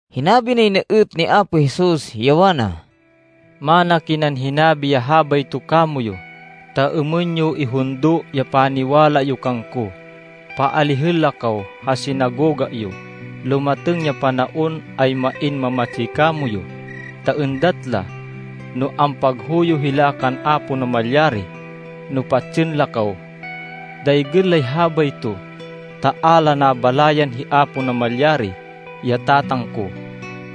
Hinabi nay na êt ni Apo Jesus, ya wana, “Mana kinan hinabi ya habayto kamoyu, ta êmên yo ihundo ya paniwala yo kangko. Paalihên la kaw ha sinagoga yo. Lumatêng ya panaon ay main mamatsi kamoyu, ta êndat la no ampaghuyo hila kan Apo Namalyari no patsên la kaw. Daygên lay habayto ta a la nabalayan hi Apo Namalyari, ya Tatang ko,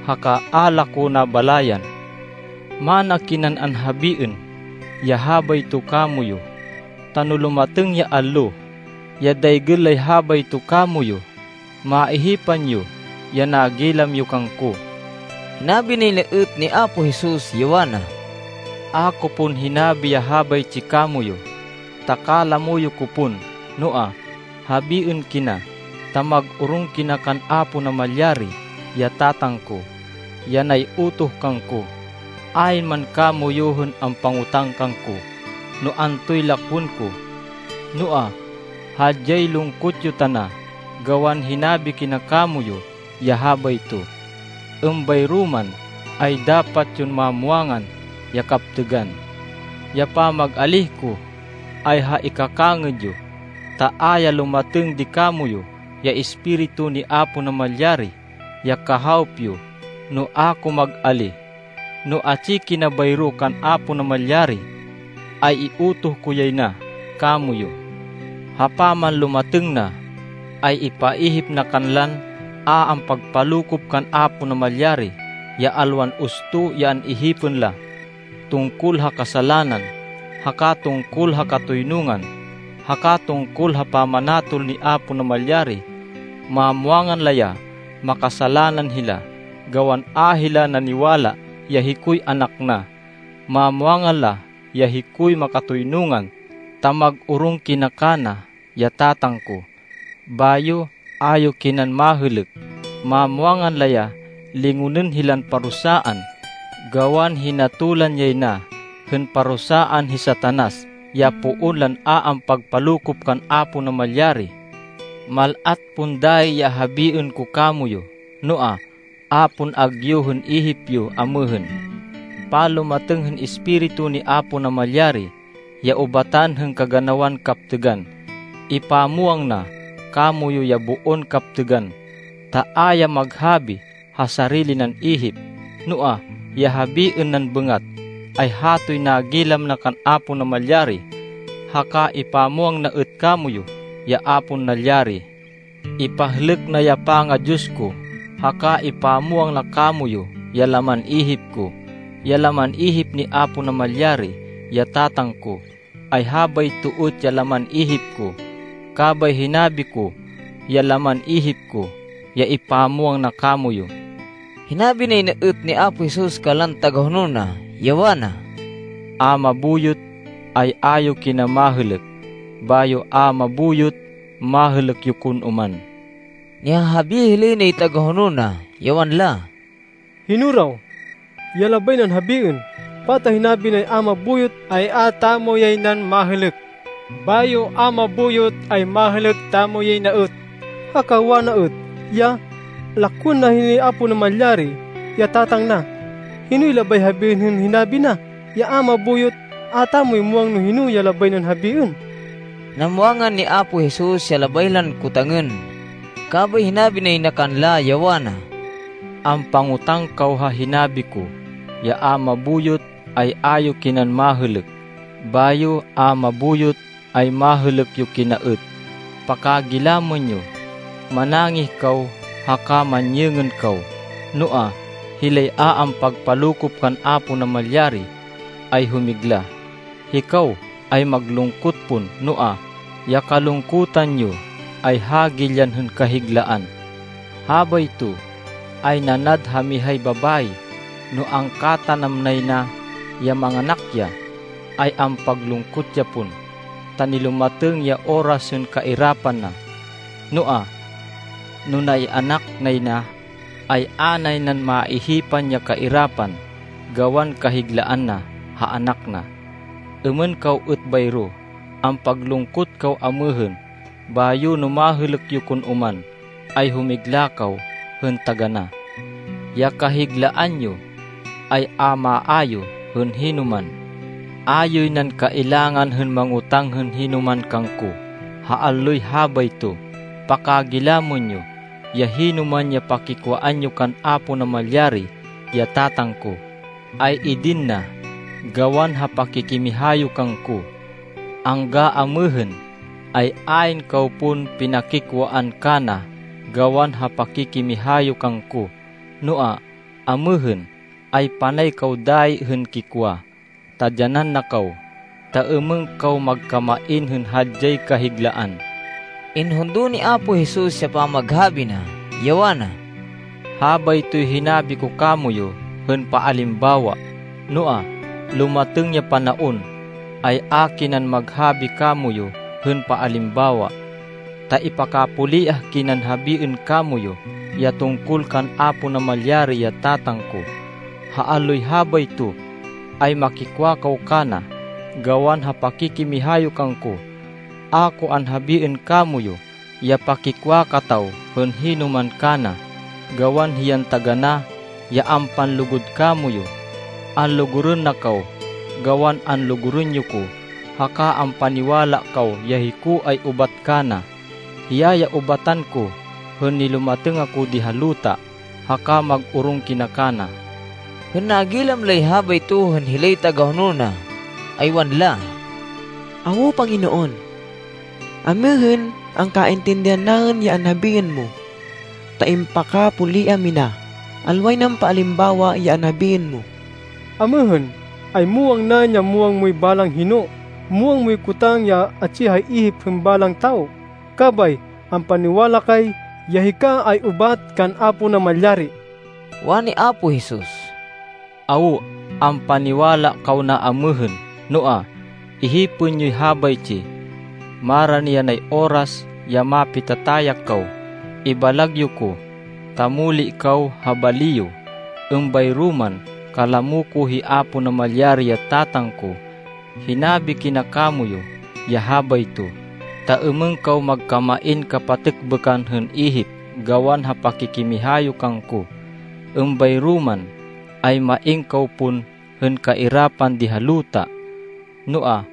haka a la ko nabalayan. Mana kinan anhabiên ya habayto kamoyu, ta no lumatêng ya allo, ya daygên lay habayto kamoyu, maihipan yo ya nagilam yo kangko.” Hinabi nay na êt ni Apo Jesus, ya wana, “A ko pon hinabi ya habaytsi kamoyu, ta kalamo yo ko pon. Noa, habiên kina, ta mag-orong kina kan Apo Namalyari, ya Tatang ko, ya nay-utoh kangko. Ayn man kamoyu hên ampangotang kangko no antoy lakwên ko. Noa, hadyay lungkot yo tana gawan hinabi kina kamoyu ya habayto. Êmbayro man, ay dapat yon mamwangan ya kaptêgan. Ya pamag-alíh ko, ay ha ikakangêd yo, ta a ya lumatêng di kamoyu ya Espiritu ni Apo Namalyari, ya Kahawop yo, no a ko mag-alíh. No atsi kina bayro kan Apo Namalyari ay iutoh ko yay na kamoyu. Ha pamanlumatêng na, ay ipaihip na kanlan a ampagpalokop kan Apo Namalyari, ya alwan usto ya an-ihipên la tungkol ha kasalanan, haka tungkol ha katoynungan, haka tungkol ha pamanatol ni Apo Namalyari. Mamwangan la ya makasalanan hila, gawan a hila naniwala ya hikoy Anak na. Mamwangan la ya hikoy makatoynungan, ta mag-orong kina kana, ya Tatang ko. Bayo a yo kinan mahêlêk. Mamwangan la ya lingonên hilan parusaan, gawan hinatolan yay na hên parusaan hi Satanas, ya poon lan a ampagpalokop kan Apo Namalyari.” “Mal-at pon dayi ya habiên ko kamoyu. Noa, a pon agyu hên ihip yo amêhên. Panlumatêng hên Espiritu ni Apo Namalyari, ya ubatan hên kaganawan kaptêgan, ipamwang na kamoyu ya boon kaptêgan, ta a ya mag-habi ha sarili nan ihip, noa, ya habiên nan bêngat, ay hatoy nagilam na kan Apo Namalyari. Haka ipamwang na êt kamoyu ya a pon nalyari. Ipahlêk na ya panga-Diyos ko, haka ipamwang na kamoyu ya laman ihip ko. Ya laman ihip ni Apo Namalyari, ya Tatang ko, ay habayto êt ya laman ihip ko, kabay hinabi ko ya laman ihip ko, ya ipamwang na kamoyu.” Hinabi nay na êt ni Apo Jesus kanlan tagahonol na, ya wana, “A mabuyot, ay a yo kina mahêlêk. Bayo, a mabuyot, mahêlêk yo kon oman.” Nihahabi hilay nay tagahonol na, ya wanla, “Hino raw ya labay nan habiên? Pata hinabi nay a mabuyot, ay a tamo yay nan mahêlêk, bayo a mabuyot, ay mahêlêk tamo yay na êt. Haka wana êt ya, lakwên na hi Apo Namalyari, ya Tatang na. Hinoy labay habiên, hên hinabi na ya a mabuyot? A tamo muwang no hino ya labay nan habiên.” Namwangan ni Apo Jesus ya labay lan kotangên, kabay hinabi nay na kanla, ya wana, “Ampangotang kaw ha hinabi ko ya a mabuyot ay a yo kinan mahêlêk, bayo a mabuyot ay mahêlêk yo kina êt. Pakagilamên yo. Manangih kaw haka manyêngên kaw. Noa, hilay a ampagpalokop kan Apo Namalyari ay humigla. Hikaw ay maglungkot pon, noa, ya kalungkutan yo ay hagilyan hên kahiglaan. “Habayto ay nanad ha mihay babayi, no angkatanam nay na ya manganak ya, ay ampaglungkot ya pon, ta nilumatêng ya oras hên kairapan na. Noa, no na-ianak nay na, ay a nay nan maihipan ya kairapan, gawan kahiglaan na ha anak na. Êmên kaw êt bayro. Ampaglungkot kaw amêhên, bayo no mahêlêk yo kon oman, ay humigla kaw hên taganá. Ya kahiglaan yo ay a maayu hên hinoman. “A yoy nan kailangan hên mangotáng hên hinoman kangko ha alloy habayto. Pakagilamên yo, ya hinoman ya pakikwaan yo kan Apo Namalyari, ya Tatang ko, ay idin na gawan ha pakikimiha yo kangko. Angga amêhên, ay ayn kaw pon pinakikwaan kana gawan ha pakikimiha yo kangko. Noa, amêhên, ay panay kaw dayi hên kikwa, ta dyanan na kaw, ta êmên kaw magkamain hên hadyay kahiglaan.” Inhundo ni Apo Jesus ya pamaghabi na, ya wana, “Habaytoy hinabi ko kamoyu hên paalimbawa. Noa, lumatêng ya panaon, ay a kinan maghabi kamoyu hên paalimbawa, ta ipakapuliah kinan habiên kamoyu ya tungkol kan Apo Namalyari, ya Tatang ko. Ha alloy habayto, ay makikwa kaw kana, gawan ha pakikimiha yo kangko. A ko anhabiên kamoyu ya pakikwa kataw hên hinoman kana, gawan hiyan taganá ya ampanlugud kamoyu. Anlugurên na kaw gawan anlugurên yo ko haka ampaniwala kaw ya hiko ay ubat kana. Hiya ya ubatan ko hên nilumatêng ako di ha luta. Haka mag-orong kina kana.” Hên nagilam lay habayto hên hilay tagahonol na, ay wanla, “Awo, Panginoon. Amêhên, angkaintindihan naên ya anhabiên mo, ta impakapuliah mina. Alway nan paalimbawa ya anhabiên mo. Amêhên, ay muwang naên ya muwang moy balang hino. Muwang moy kotang ya atsi ha ihip hên balang tawo. Kabay ampaniwala kay, ya hika ay ubat kan Apo Namalyari.” Wani Apo Jesus, “Awo, ampaniwala kaw na amêhên. Noa, ihipên yoy habaytsi. Marani yanay oras ya mapitatayak kaw. Ibalag yo ko, ta muli kaw ha bali yo. Êmbayro man, kalamo ko hi Apo Namalyari, ya Tatang ko. Hinabi kina kamoyu ya habayto, ta êmên kaw magkamain kapatêkbêkan hên ihip gawan ha pakikimiha yo kangko. Êmbayro man, ay main kaw pon hên kairapan di ha luta. Noa,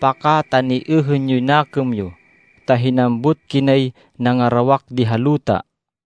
pakataniêhên yoy nakêm yo, ta hinambut kinay nangarawak di ha luta.”